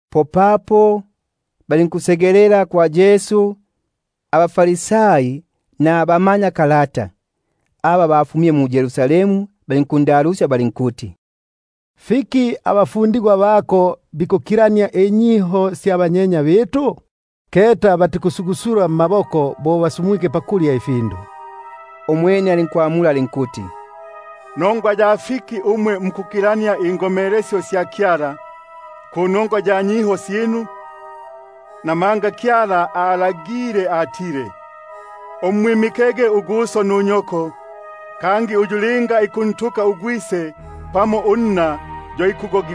Popapo balinkwisa kwa Yesu abaFarisai nabamanyakalata aba bafumile mu-Yerusalemu, balinkuyoba balinkuti: Fiki abafundigwa bako bikukilania inyiho sya ba mbukulu? Buno batikusugusula mmaboko bo bikulya ifindu. Umwene alinkwamula alinkuti: Nongwa ya fiki umwe mukukilania ulukomelesyo lwa Kyala panongwa ya nyiho syinu? Namanga Kyala alagile ukuti: Mwimike uguso nunyoko, kangi, uyu linga ikuntuka ugwise pamo unna yo fikuti afwege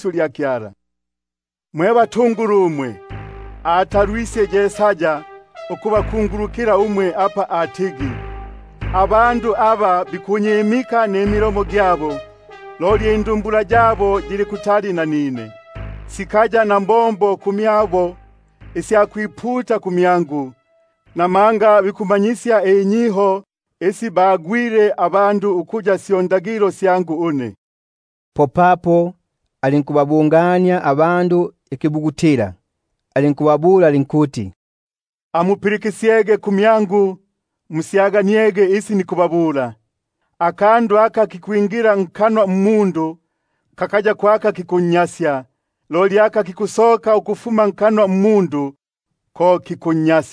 lya Kyala nulwiho lwinu. Mwe basyobi umwe, atalwisye Yesaya apa akungulukaga isyinu umwe apa atigi: Abandu aba bikunyimika na gi milomo, Loli indumbula syabo sili pabutali nanine; Ukungwila ulupi kwabo kwa itolo, Bikumanyisya imanyisyo isi syo ngomelesyo sya bandu. Popapo alinkukibilikila ikilundilo alinkuti: Amupilikisyege musyaganiege: Kakaya ko aka kikwingila nkanwa aka kikunnyasya umundu, loli aka ikusoka nkanwa ko aka ikunnya-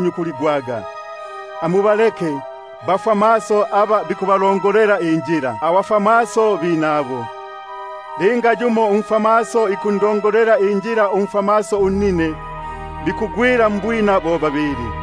nyukuligwaga. Amubaleke; bababa bo bafwamaso aba bikubalongosya abafwamaso abinabo. Apa linga umfwamaso ikundongosya umfwamaso unnine, po bosa bo babili bikubu-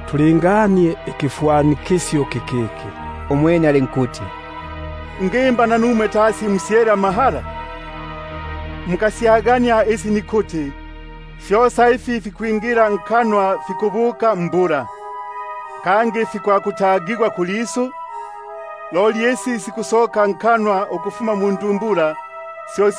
Tulinganie ikifwanikisyo iki. Umwene alinkuti: Nanumwe mukali mukaya namahala na ulu? Mutikusyagania ukuti kosa aka lukwingila nkanwa kikukinda mbula nukutagigwa kulisu? Loli ifi fikusoka nkanwa Akufuma mundumbula, fyo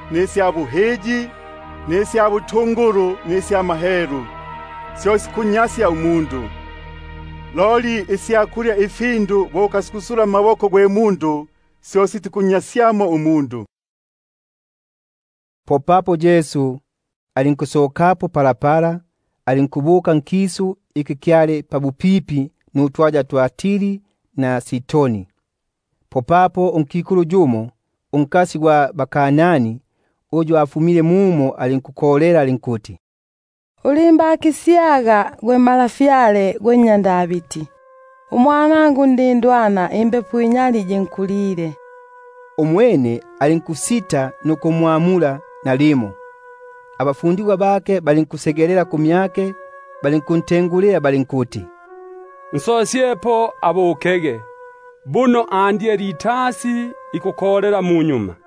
hani, ubuhiyi, nubuketi bwa butungulu, namahelu. Fyo ifi fikunnyasya umundu; loli isya kulya namaboko amanyali sitikunnyasyamo umundu. Popapo Yesu alinkusokako, alinkubuka nkisu kya Tiri na Sidoni. Popapo unkikulu unKanani uyu afumile nkisu mumo, alinkukolela alinkuti: Ulimbakisyaga gwe Malafyale gwe nnya Davidi; unwanangu undindwana imbepo inyali yinkolile fiyo. Umwene alinkusita nukumwamula nalimo. Popapo abafundigwa bake balinkwisa kumyake balinkunsuma balinkuti: Nsosyepo abukege, buno ikutusingula munyuma.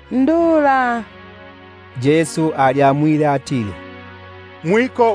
ulindula. Yesu alinkwamula alinkuti: Kukaya kununu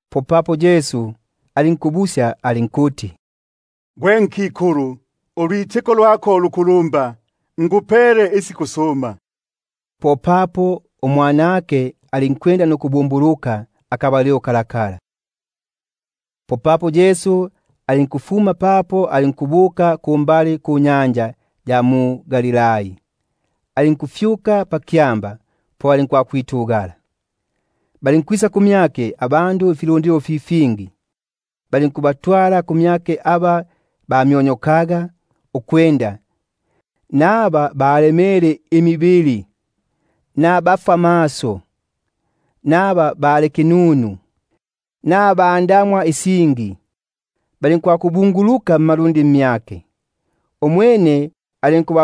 Umwene Yesu alinkumwamula alinkuti: Gwe nkikulu, ulwitiko lwako lukulumba, asikwisilege bo mumo kulondela. Popapo umwanake alinkubumbuluka pakabalilo kako. Popapo Yesu alinkusokako, alinkwakufika pambali panyanja ya Galihi; alinkufyuka pakyamba po alinkwitugasya. Ifilu- ndilo fi fingi filinkunkulukila, filinkuntwalila aba bamyonyokaga, aba bakwemaga, abafwamaso, aba bali kinunu, nabangi ba bingi, balinkubabika mmalundi gake, umwene alinku-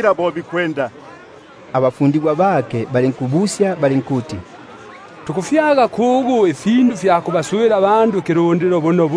Abene abafundigwa bake balinkumbula balinkuti: Tufyage kugu ndukubo muno ifindu ifya kukifwana ikilundilo kyosa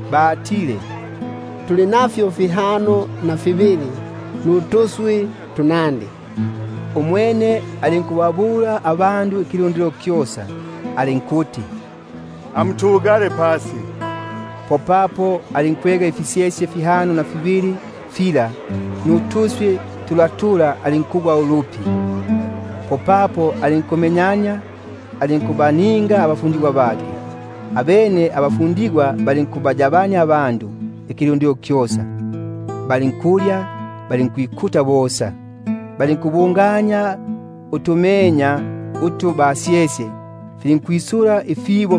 Balinkuti: Fihano na fibili nutuswi tumo. Alinkulagila ukuti abandu ikilundilo kyosa batugasye pasi. Popapo alinkwega ifisyesye fihano na fibili fila nutuswi tula, alinkugwa ulupi, alinkumenyania, alinkubapa abafundigwa; abene abafundigwa balinkufipa ifilundilo. Bosa balinkulya balinkwikuta. Popapo balinkusala utumenya utu twasyele, balinkwisusya ifibo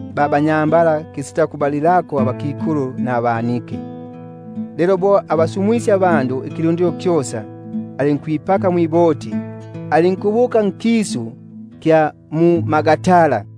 abanyambala, kisitakubala abakikulu nabana. Lelo bo afisumwisye ifilundilo, alinkwipaka mwiboti, alinkubuka nkisu kya mu-Magadani.